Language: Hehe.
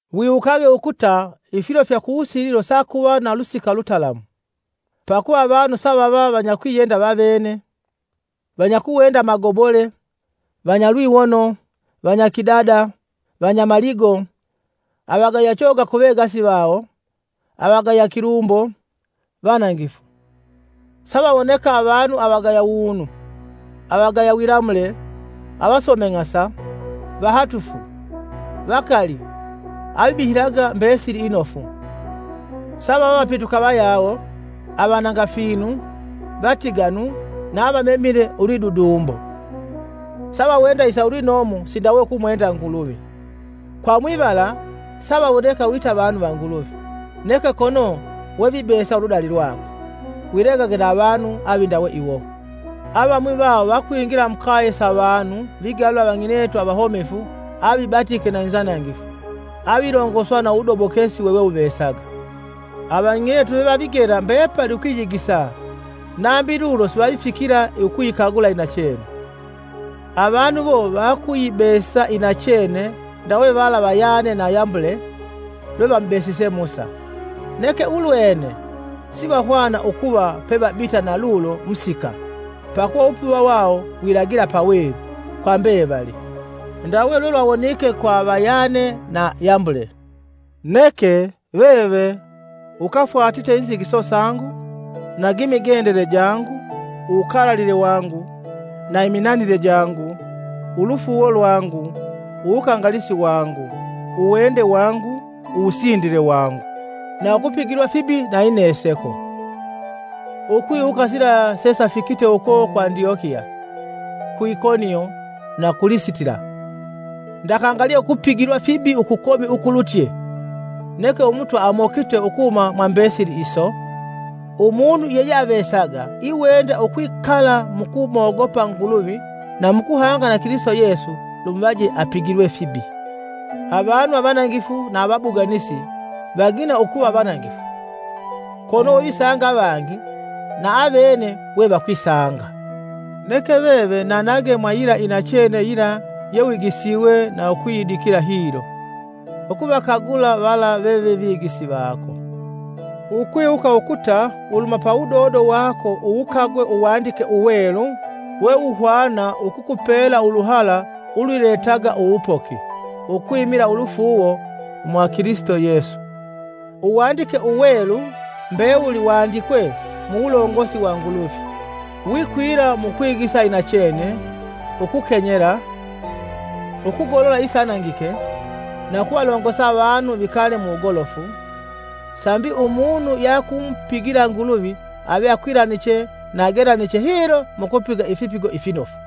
Wiwukage ukuta, ifilo fya kuwusililo sakuva na lusika lutalamu. Pakuva avanu savava vanyakwiyenda vavene, vanyakuwenda amagobole, vanyalwiwono, vanyakidada, vanyamaligo, avagaya choga ku vegasi vawo, avagaya kilumbo, vanangifu, Savawoneka avanu avagaya wunu, avagaya wilamule, avasomeng'asa, vahatufu, vakali, avibihilaga mbesili inofu; savava vapituka vayawo, avananga finu, vatiganu na avamemile lwidudumbo; savawenda isa ulwinomo sindawe ukumwenda Nguluvi. Kwa mwivala savawoneka wita vanu va Nguluvi, neke kono wevibesa uludali lwakwe. Wilegage na avanu avindawe iwo. Avamwi vawo vakwingila mukaye sa vanu vigalula avang'inetu avahomefu avafuuvitwe na inzanangifu avilongoswa na uwudobokesi wewewuvesaga; avang'inetu vevavigela mbepali ukwiyigisa nambi lulo sivavifikila ukuyikagula inachene. Avanu iwo vakuyibesa inachene ndawe vala va Yane na Yambule lwevamubesise Musa. Neke ulwene sivahwana ukuva pevabita na lulo musika pakuva uwupuva wawo wilagila pawelu kwa mbevali. Ndawe lwelwawonike kwa va Yane na Yambule. Neke, veve, ukafwatite inzigiso sangu nagimigendele jangu, uwukalalile wangu, na iminanile jangu, ulufuuwo lwangu, uwukangalisi wangu, uwende wangu, uwusindile wangu. na ukupigilwa fibi na ineseko. Ukwiwuka sila sesafikite uko ku Andyokiya, ku Ikonio, na ku Lisitila. Ndakangalye ukupigilwa fibi ukukomi ukulutye! Neke Umutwa amokite ukuhuma mwambesili iso. Umunu yeyeavesaga iwenda ukwikala mukumogopa Nguluvi na mukuhanga na Kilisito Yesu lumuvaje apigilwe fibi. Avanu avanangifu na avabuganisi vagina ukuva vanangifu, kono visanga avangi na avene we vakwisanga. Neke veve nanage mwa yila inachene yila yewigisiwe na ukuyidikila hilo. Ukuvakagula vala veve vigisi vako, ukwiwuka ukuta uluhuma pa wudodo wako uwukagwe Uwandike Uwelu wewuhwana ukukupela uluhala ulwiletaga uwupoki ukwimila ulufuuwo mwa Kilisito Yesu. Uwandike Uwelu mbewuli wandikwe muwulongosi wa Nguluvi, wikwila mu kwigisa inachene, ukukenyela, ukugolola isanangike, na ukuvalongosa avanu vikale muwugolofu, sambi umunu yeakumupigila Nguluvi ave akwilaniche na agelaniche hilo mukupiga ifipigo ifinofu.